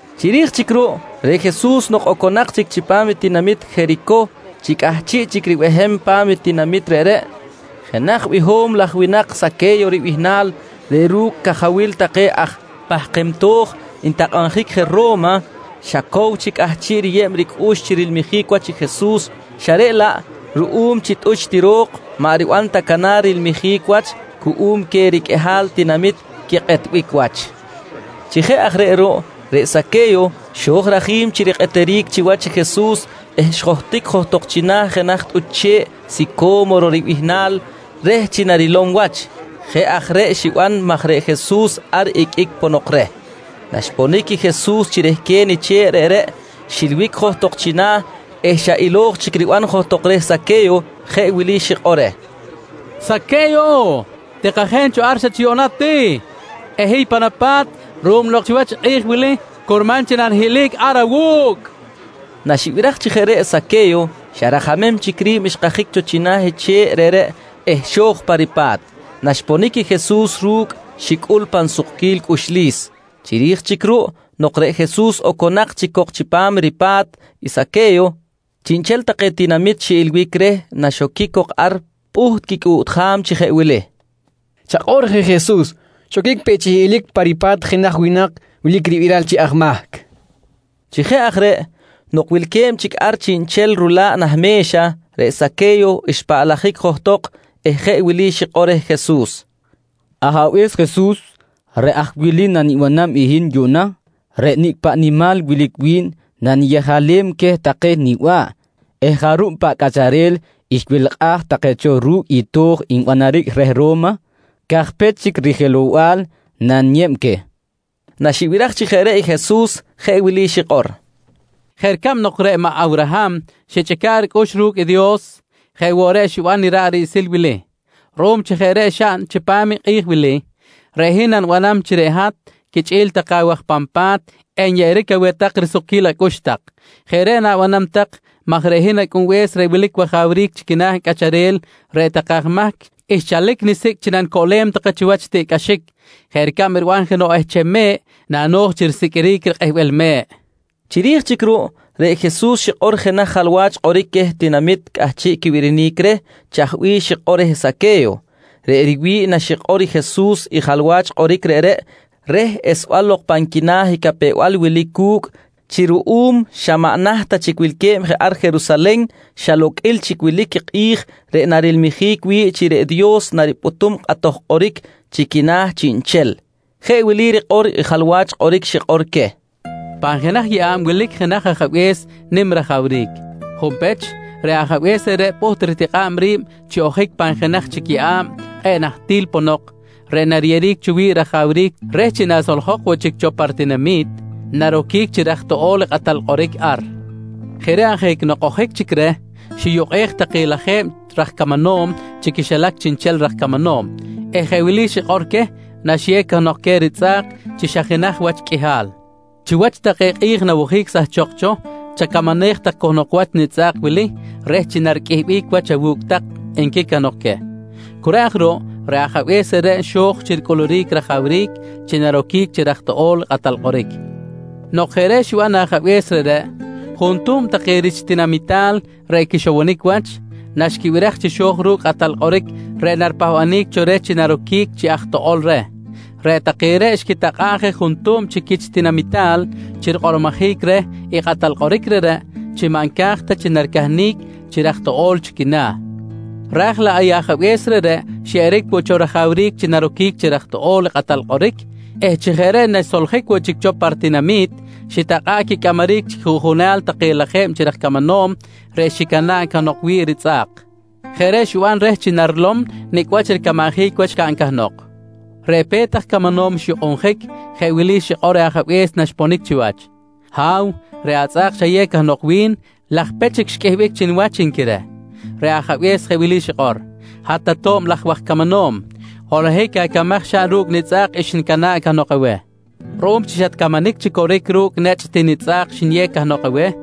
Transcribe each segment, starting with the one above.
Chiri̱j chic ruꞌ reꞌ Jesus nok oconak chic chipam i tinamit Jericoh chi cꞌahchiꞌ chic ribehem pa̱m tinamit reꞌreꞌ, jenaj biho̱m laj winak Saque̱yo ribihnal reꞌ ru̱cꞌ cajawil take aj pahkem to̱j ntakꞌabjic je Ro̱ma, xa cow chic cꞌahchiꞌ riyeb ricꞌux chi rilmijic wach i Jesus, xa reꞌ laꞌ ruꞌum chi tꞌuch ti ro̱k maꞌ riban ta canar rilmijic wach cuꞌum queh riqꞌuihal tinamit quikꞌetbic wach. Chi jeꞌ aj reꞌ ruꞌ, reꞌ Saque̱yo xo̱j rajim chi rikꞌeteric chiwach i Jesus eh xjohtic johtok china̱ jenaj tꞌuch che̱ꞌ sico̱moro ribihnal reh chi narilom wach. Jeꞌ aj reꞌ xiban maj reꞌ Jesus ar iqꞌuic ponok reh. Naxponic i Jesus chi rehquen i che̱ꞌ reꞌreꞌ xilbic johtok china̱ eh xa ilo̱j chic riban johtok reh i Saque̱yo jeꞌ wili xikꞌor reh: «Saque̱yo, tikajen cho ar xa chi yuꞌna ti eh hiy pan apa̱t ruꞌum nok chiwach i kꞌi̱j wili curman chi nanihiꞌlic ar awu̱cꞌ, nqui reh. Naxibiraj chi jeꞌ reꞌ i Saque̱yo xa rajamem chic ri̱b xkajic cho china̱ i che̱ꞌ reꞌreꞌ eh xo̱j pa ripa̱t. Naxponic i Jesus ru̱cꞌ xicꞌul pan sukquil cꞌuxlis. Chiri̱j chic ruꞌ nok reꞌ Jesus oconak chic cok chipam i ripa̱t i Saque̱yo, chiꞌnchel take tinamit xiꞌilbic reh naxoquic cok ar pꞌuht quicꞌuꞌtjam chi jeꞌ wili: «Chakꞌor je Jesus, xoquic peꞌ chi hiꞌlic pa ripa̱t jenaj winak wilic ribiral chi aj mahc, nqui take. Chi jeꞌ aj reꞌ nok wilque̱b chic ar chiꞌnchel rula̱ꞌ nah me̱xa, reꞌ Saque̱yo xpaꞌlajic johtok eh je wili xikꞌor reh Jesus: «Ajabe̱s Jesus, reꞌ aj wili nanibanam hin yuꞌna: Reꞌ nicꞌ paꞌ nimal wilic wi̱n naniyejalem queh take niba̱ꞌ eh jarub paꞌ cꞌacharel xwelkꞌaj take cho ru̱cꞌ i to̱j nbanaric reh Ro̱ma cajpech chic rijelow-bal naniyeb queh, nqui. Naxibiraj chi jeꞌ reꞌ i Jesus jeꞌ wili xikꞌor: «Jeꞌ ricab nok reꞌ maꞌ Awraham xichꞌica̱ꞌ ricꞌux ru̱cꞌ i Dios, jeꞌ woꞌ reꞌ xiban i ra̱ꞌ riꞌsil wili. Ruꞌum chi jeꞌ reꞌ xaꞌn chipam i kꞌi̱j wili, reꞌ hin nanibanam chi reꞌ hat quichꞌi̱l take awaj pan pa̱t enyeꞌeric aweh tak risukquil acꞌux tak. Jeꞌ reꞌ nanibanam maj reꞌ hin Acꞌunbe̱s reꞌ wilic wajawric chi quina̱ cꞌacharel, reꞌ take aj mahc xchalic nisicꞌ chi nanicoꞌlem take chiwach i tiꞌcꞌaxic jeꞌ ricab riban jenoꞌ ehcham me̱ꞌ nano̱j chi risiqꞌuiric rikꞌehbel me̱ꞌ, nqui Jesus. Chiri̱j chic ruꞌ, reꞌ Jesus xikꞌor jenaj jalwach kꞌoric queh tinamit cꞌahchiꞌ quibirinic reh chaj bih xikꞌor reh Saque̱yo. Reꞌ riwi̱ꞌ naxikꞌor Jesus i jalwach kꞌoric reꞌreꞌ reh esbal lok pan quina̱ i capew-bal wilic cu̱cꞌ chi ruꞌum xa maꞌ naht ta chic wilque̱b je ar Jerusalen, xa loqꞌuil chic wilic i kꞌi̱j reꞌ narilmijic wi̱ꞌ chi reꞌ Dios naripꞌutum kꞌatoj kꞌoric chi quina̱ chiꞌnchel. Jeꞌ wili rikꞌor i jalwach kꞌoric xikꞌor queh: «Pan jenaj yeꞌa̱b wilic jenaj ajabe̱s nim rajawric. Junpech, reꞌ ajabe̱s reꞌreꞌ pꞌuht ritikꞌa̱b ri̱b chi ojic pan jenaj chic yeꞌa̱b kꞌe̱ꞌ nahtil ponok reꞌ nariyeꞌeric cho wi̱ꞌ rajawric reh chi nasoljok woꞌ chic cho pa ritinami̱t, naroquic chi raj toꞌo̱l i kꞌatal kꞌoric ar. Jeꞌ reꞌ ajic nok ojic chic reh, xiyukꞌej take lajeb raj camanom chi quixilac chiꞌnchel raj camanom eh jeꞌ wili xikꞌor queh naxiyew cahnok queh ritzꞌa̱k chi xa jenaj wach qꞌuihal: ‹Chiwach take kꞌi̱j nawojic sahchok cho, chacamanej tak cahnok wach nitzꞌa̱k wili reh chi nariqꞌuihbic wach awu̱cꞌ tak, nqui cahnok queh. «Cu reꞌ aj ruꞌ, reꞌ ajabe̱s reꞌreꞌ xo̱j chi ricꞌuluric rajawric chi naroquic chi raj toꞌo̱l i kꞌatal kꞌoric. Nok jeꞌ reꞌ xiban i ajabe̱s reꞌreꞌ, juntuhm take rich ritinamital reꞌ quixowonic wach, naxquibiraj chi xo̱j ru̱cꞌ i kꞌatal kꞌoric reꞌ naripahbanic cho reh chi naroquic chi aj toꞌo̱l reh, reꞌ take reꞌ xquitakꞌa̱ꞌ je juntuhm chi quich tinamital chi rikꞌormojic reh i kꞌatal kꞌoric reꞌreꞌ chi maꞌ nca̱j ta chi naricahnic chi raj toꞌo̱l chi quina̱. Raj laꞌ i ajabe̱s reꞌreꞌ xyeꞌeric woꞌ cho rajawric chi naroquic chi raj toꞌo̱l i kꞌatal kꞌoric eh chi jeꞌ reꞌ naxsoljic woꞌ chic cho pa ritinami̱t, xitakꞌa̱ꞌ quicꞌamaric chi quijuꞌjunal take lajeb chi raj camanom reꞌ xicana̱ꞌ cahnok wi̱ꞌ ritzꞌa̱k. Jeꞌ reꞌ xiban reh chi narilom nicꞌ wach ricamanjic wach xcaꞌn cahnok. Reꞌ pe̱t aj camanom xyukꞌunjic, jeꞌ wili xikꞌor reh ajabe̱s naxponic chiwach: ‹Ha̱w, reꞌ atzꞌa̱k xayew cahnok wi̱n laj pech chic xqꞌuihbic chi niwach, nqui reh. «Reꞌ ajabe̱s jeꞌ wili xikꞌor: ‹Hat ato̱b laj waj camanom, holohic acamaj xaꞌn ru̱cꞌ i nitzꞌa̱k xnicana̱ꞌ cahnok aweh. Ruꞌum chi xatcamanic chi coric ru̱cꞌ ti nechꞌ nitzꞌa̱k xniyew cahnok aweh,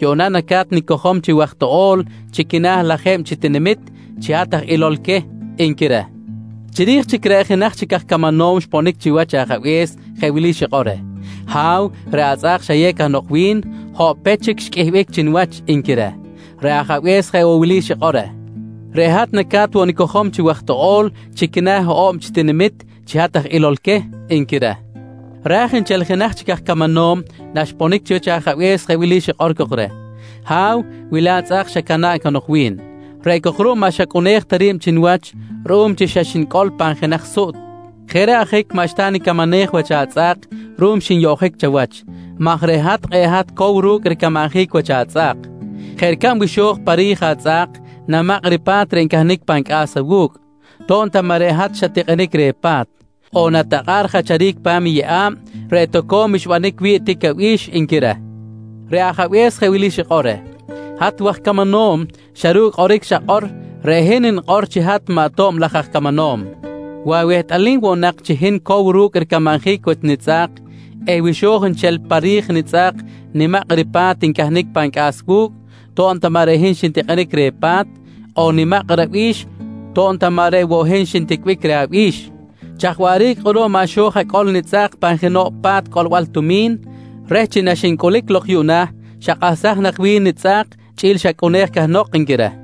yuꞌna naca̱t nicojom chi waj toꞌo̱l chi quina̱ lajeb chi tinamit chi hat aj ilol queh, nqui reh. «Chiri̱j chic reꞌ jenaj chic aj camanom xponic chiwach ajabe̱s jeꞌ wili xikꞌor reh: ‹Ha̱w, reꞌ atzꞌa̱k xayew cahnok wi̱n hoꞌpech chic xqꞌuihbic chi niwach, nqui reh. «Reꞌ ajabe̱s jeꞌ woꞌ wili xikꞌor reh: ‹Reꞌ hat naca̱t woꞌ nicojom chi waj toꞌo̱l chi quina̱ hoꞌo̱b chi tinamit chi hat aj ilol queh, nqui reh. «Raj nchel i jenaj chic aj camanom naxponic chiwach ajabe̱s jeꞌ wili xikꞌor cok reh: ‹Ha̱w, wili atzꞌa̱k xacana̱ꞌ cahnok wi̱n. Reꞌ cok ruꞌ maꞌ xacꞌunej ta ri̱b chi niwach ruꞌum chi xa xnicꞌol pan jenaj suꞌt. Jeꞌ reꞌ ajic maꞌxta nicamanej wach atzꞌa̱k ruꞌum xinyoꞌjic chawach maj reꞌ hat kꞌe̱ꞌ hat cow ru̱cꞌ ricamanjic wach atzꞌa̱k. Jeꞌ ricab wi xo̱j pa ri̱j atzꞌa̱k, namakꞌ ripa̱t reꞌ ncahnic pan cꞌa̱s awu̱cꞌ, to̱b ta maꞌ reꞌ hat xat-tikꞌinic reh pa̱t. On natakꞌa̱ꞌ rijacharic pa̱m i yeꞌa̱b reꞌ toco̱m xbanic wi̱ꞌ tic abi̱x, nqui reh. «Reꞌ ajabe̱s jeꞌ wili xikꞌor reh: ‹Hat waj camanom, xa ru̱cꞌ i kꞌoric xakꞌor reꞌ hin nikꞌor chi hat maꞌ ato̱b laj aj camanom. Wi awehtꞌalim woꞌ nak chi hin cow ru̱cꞌ ricamanjic wach nitzꞌa̱k eh wi xo̱j nchel pa ri̱j nitzꞌa̱k nimak ripa̱t reꞌ ncahnic pan cꞌa̱s wu̱cꞌ to̱b ta maꞌ reꞌ hin xintikꞌinic reh pa̱t on nimak i rabi̱x to̱b ta maꞌ reꞌ woꞌ hin xinticbic reh abi̱x, chaj waꞌric kꞌuruꞌ maꞌ xo̱j acꞌol nitzꞌa̱k pan jenoꞌ pa̱t cꞌolbal tumi̱n reh chi naxincꞌulic lok yuꞌna xakꞌahsaj nak wi̱n nitzꞌa̱k chꞌi̱l i xacꞌunej cahnok? nqui reh.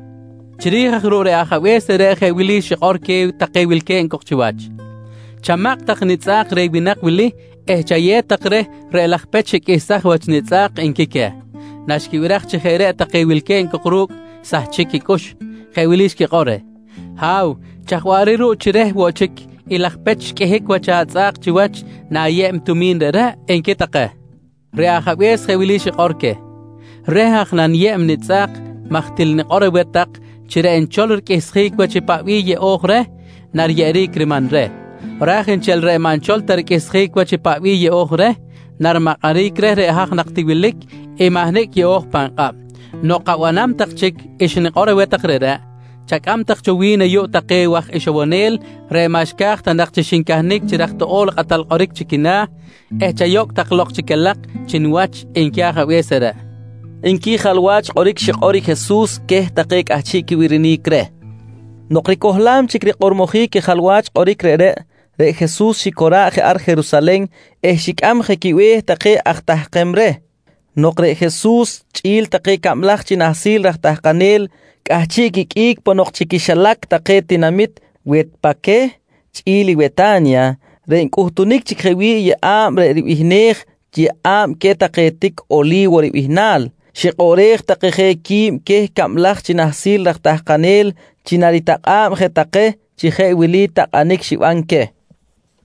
«Chiri̱j aj ruꞌ reꞌ ajabe̱s reꞌreꞌ jeꞌ wili xikꞌor queh take wilque̱b chiwach: ‹Chamakꞌ tak nitzꞌa̱k reh winak wili eh chayew tak reh reꞌ laj pech xiqꞌuihsaj wach nitzꞌa̱k, nqui queh. «Naxquibiraj chi jeꞌ reꞌ take wilque̱b cok ru̱cꞌ xsahchic quicꞌux, jeꞌ wili xquikꞌor reh: ‹Ha̱w, chaj waꞌric ruꞌ chi reh woꞌ chic i laj pech qꞌuihbic wach atzꞌa̱k chiwach na̱yeb i tumi̱n reꞌreꞌ? nqui take. «Reꞌ ajabe̱s jeꞌ wili xikꞌor queh: ‹Reh aj reꞌ naniyeb i nitzꞌa̱k maj til nikꞌor aweh tak chi reꞌ nchol riqꞌuihsjic wach i paꞌ bih yeꞌo̱j reh nariyeꞌeric riman reh, ra̱j nchel reꞌ maꞌ nchol ta riqꞌuihsjic wach i paꞌ bih yeꞌo̱j reh, narimakꞌaric reh reꞌ haj nak ti wilic i mahnicꞌ yeꞌo̱j pan kꞌab. Nok abanam tak chic xnikꞌor aweh tak reꞌreꞌ, chacꞌam tak cho wi̱n ayuꞌ take waj ixowonel reꞌ maꞌ xca̱j ta nak chi xincahnic chi raj toꞌo̱l i kꞌatal kꞌoric chi quina̱ eh chayocꞌ tak lok chi calak chi niwach, nqui ajabe̱s reꞌreꞌ, nqui jalwach kꞌoric xikꞌor i Jesus queh take cꞌahchiꞌ quibirinic reh. Nok ricohlam chic rikꞌormojic i jalwach kꞌoric reꞌreꞌ, reꞌ Jesus xicora̱ꞌ je ar Jerusalen eh xicꞌam je quibe̱h take aj tahkem reh. Nok reꞌ Jesus chꞌi̱l take cablaj chi nahsil raj tahkanel cꞌahchiꞌ quiqꞌuic ponok chi quixilac take tinamit Wetpaqueh chꞌi̱l i Weta̱nya reꞌ ncꞌutunic chic je wi̱ꞌ i yeꞌa̱b reꞌ ribihnej “Yeꞌa̱b queh take tic Oli̱wo ribihnal”, xikꞌoꞌrej take je qui̱b queh cablaj chi nahsil raj tahkanel chi naritakꞌa̱b je take chi jeꞌ wili takꞌanic xiban queh: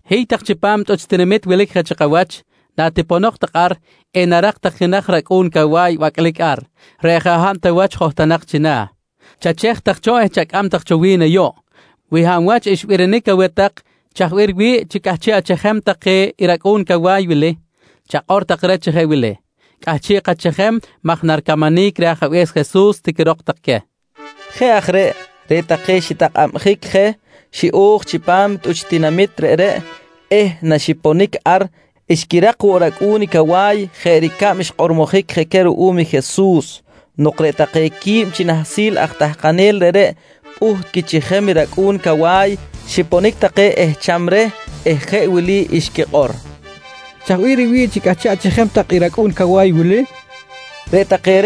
«Hiy tak chipam tꞌuch tinamit wilic je chi kawach. Natiponok tak ar, enarak tak jenaj racꞌu̱n cawa̱y bacꞌlic ar, reꞌ jaꞌ hab ta wach johtonak china̱. Chachej tak cho eh chacꞌam tak cho wi̱n ayuꞌ. Wi hab wach xbirinic aweh chaj bih riwi̱ꞌ chi cꞌahchiꞌ achejem tak i racꞌu̱n cawa̱y wili, chakꞌor tak reh chi jeꞌ wili: ‹Cꞌahchiꞌ kachejem maj naricamanic reh Ajabe̱s Jesus, tiquirok tak queh, nqui Jesus. Jeꞌ aj reꞌ, reꞌ take xitakꞌabjic je xiꞌo̱j chipam tꞌuch tinamit reꞌreꞌ eh naxiponic ar xquirak woꞌ racꞌu̱n cawa̱y jeꞌ ricab xkꞌormojic je queh ruꞌum i Jesus. Nok reꞌ take quib chi nahsil aj tahkanel reꞌreꞌ pꞌuht quichejem i racꞌu̱n cawa̱y, xiponic take ehcham reh eh jeꞌ wili xquikꞌor: «Chaj bih riwi̱ꞌ chi cꞌahchiꞌ achejem tak i racꞌu̱n cawa̱y wili? nqui take.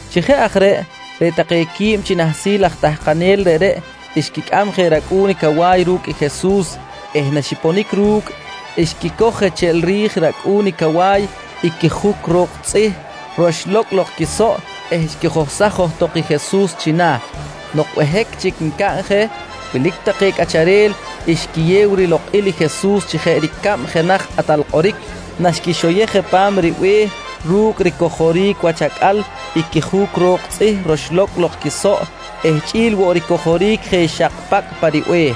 Chi jeꞌ aj reꞌ, reꞌ take quib chi nahsil aj tahkanel reꞌreꞌ xquicꞌam je racꞌu̱n cawa̱y ru̱cꞌ Jesus eh naxponic ru̱cꞌ, xquicoj je cheꞌl ri̱j i racꞌu̱n i cawa̱y i quijuc ro̱k tzꞌih roxlo̱cꞌ lok quisoꞌ eh xquijohsaj johtok i Jesus china̱. Nok behic chic ncaꞌn je, wilic take cꞌacharel xquiyew rilokꞌil i Jesus chi jeꞌ ricab jenaj kꞌatal kꞌoric naxquixoyej je pa̱m ribe̱h ru̱cꞌ ricojoric wach acꞌal i quijuc ro̱k tzꞌih roxlo̱cꞌ lok quisoꞌ eh chꞌi̱l woꞌ ricojoric je xak pacꞌ pa ribe̱h.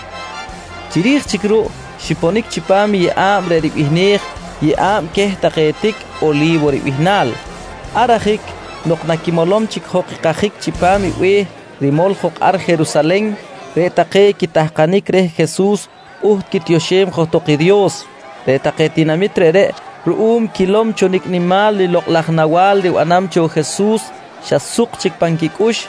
Chiri̱j chic ruꞌ xiponic chipam i yeꞌa̱b reꞌ ribihnej “Yeꞌa̱b queh take tic Oli̱wo ribihnal”. Ar ajic nok naquimolom chic jok i kajic chipam i be̱h rimol jok ar Jerusalen, reꞌ take quitahkanic reh Jesus pꞌuht quitioxem johtok i Dios. Reꞌ take tinamit reꞌreꞌ, ruꞌum quilom cho nicꞌ nimal lokꞌ laj nawa̱l ribanam cho i Jesus, xa suk chic pan quicꞌux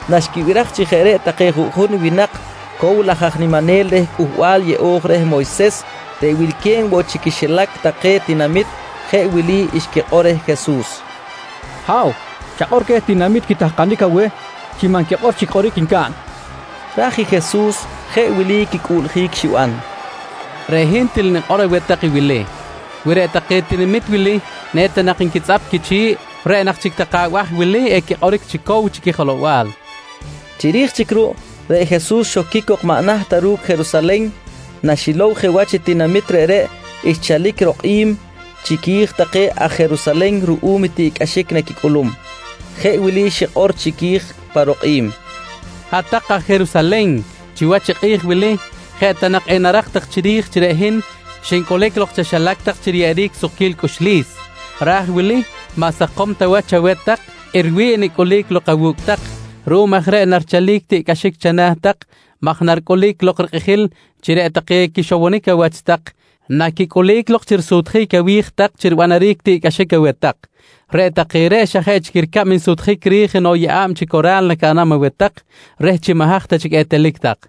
Naxquibiraj chi jeꞌ reꞌ take juꞌjun winak cow laj aj niminel reh Cꞌuhbal Yeꞌo̱j reh Moyses reꞌ wilque̱b woꞌ chi quixilac take tinamit, jeꞌ wili xquikꞌor reh Jesus: «Ha̱w, chakꞌor queh tinamit quitahkanic aweh chi maꞌ nquikꞌor chic kꞌoric ncaꞌn, nqui take reh. Ra̱j i Jesus jeꞌ wili quicꞌuꞌljic xiban: «Reꞌ hin til nikꞌor aweh tak i wili: Wi reꞌ take tinamit wili eta nak nquitzꞌap quichi̱ꞌ, reꞌ nak chic take abaj wili equikꞌoric chi cow chi quijelow-bal, nqui queh. Chiri̱j chic ruꞌ, reꞌ Jesus xoquic cok maꞌ naht ta ru̱cꞌ Jerusalen. Naxilow je wach i tinamit reꞌreꞌ xchalic rokꞌim chiqui̱j take aj Jerusalen ruꞌum i tiꞌcꞌaxic naquicꞌulum. Jeꞌ wili xikꞌor chiqui̱j pa rokꞌim: «Hat-tak aj Jerusalen, chiwach i kꞌi̱j wili jeꞌ ta nak enarak tak chiri̱j chi reꞌ hin xincꞌulic lok chaxilac tak chi riyeꞌeric sukquil cꞌuxlis. Ra̱j i wili, maꞌ sakom ta wach chaweh tak i riwi̱ꞌ nicꞌulic lok awu̱cꞌ tak. Ruꞌum aj reꞌ narichalic i tiꞌcꞌaxic chana̱ tak maj naricꞌulic lok i rikꞌijil chi reꞌ take quixowonic awach tak naquicꞌulic lok chi risutjic awi̱j tak chi ribanaric i tiꞌcꞌaxic aweh tak. Reꞌ take reꞌ xa jeꞌ chic ricab risutjic ri̱j jenoꞌ yeꞌa̱b chi cora̱l nacaꞌnam aweh tak, reh chi maꞌ haj ta chic etelic tak.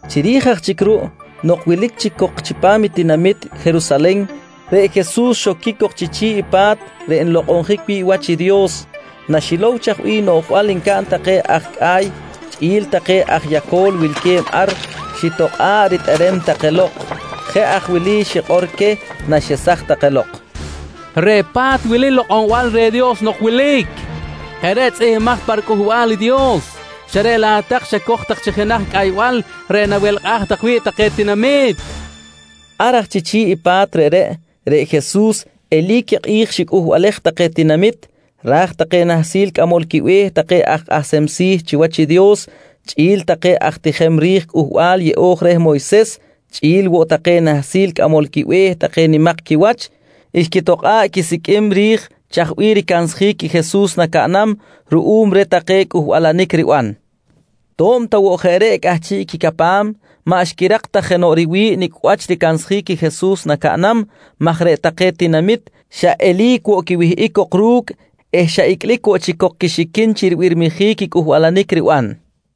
Chiri̱j aj chic ruꞌ nok wilic chic cok chipam i tinamit Jerusalen, reꞌ Jesus xoquic cok chi chi̱ꞌ i pa̱t reꞌ nlokꞌonjic wi̱ꞌ wach i Dios. Naxilow chaj bih noꞌjbal ncaꞌn take aj cꞌa̱y chꞌi̱l take aj yaco̱l wilque̱b ar, xitokꞌa̱ꞌ ritꞌerem take lok. Jeꞌ aj wili xikꞌor queh naxesaj take lok: «Reꞌ pa̱t wili lokꞌonbal reh Dios nok wilic. Jeꞌ reꞌ tzꞌihmbimaj pa riCꞌuhbal i Dios, xa reꞌ laꞌ hat-tak xacoj tak chi jenaj cꞌaybal reꞌ nawelkꞌaj tak wi̱ꞌ take tinamit, nqui queh. Ar aj chi chi̱ꞌ i pa̱t reꞌreꞌ, reꞌ Jesus eli̱c i kꞌi̱j xicꞌuhbalej take tinamit, ra̱j take nahsil cꞌamol quibe̱h take aj kꞌahsem si̱ chiwach i Dios chꞌi̱l take aj tijem ri̱j Cꞌuhbal Yeꞌo̱j reh Moyses chꞌi̱l woꞌ take nahsil cꞌamol quibe̱h take nimak quiwach, xquitokꞌa̱ꞌ quisiqꞌuim ri̱j chaj bih ricansjic i Jesus nacaꞌnam ruꞌum reh take cꞌuhbalanic riban. To̱b ta woꞌ jeꞌ reꞌ cꞌahchiꞌ quicapam, maꞌ xquirak ta jenoꞌ riwi̱ꞌ nicꞌ wach ricansjic i Jesus nacaꞌnam maj reꞌ take tinamit xa eli̱c woꞌ quiwihꞌic cok ru̱cꞌ eh xa icꞌlic woꞌ chic cok quixiquin chi ribirmijic i cꞌuhbalanic riban.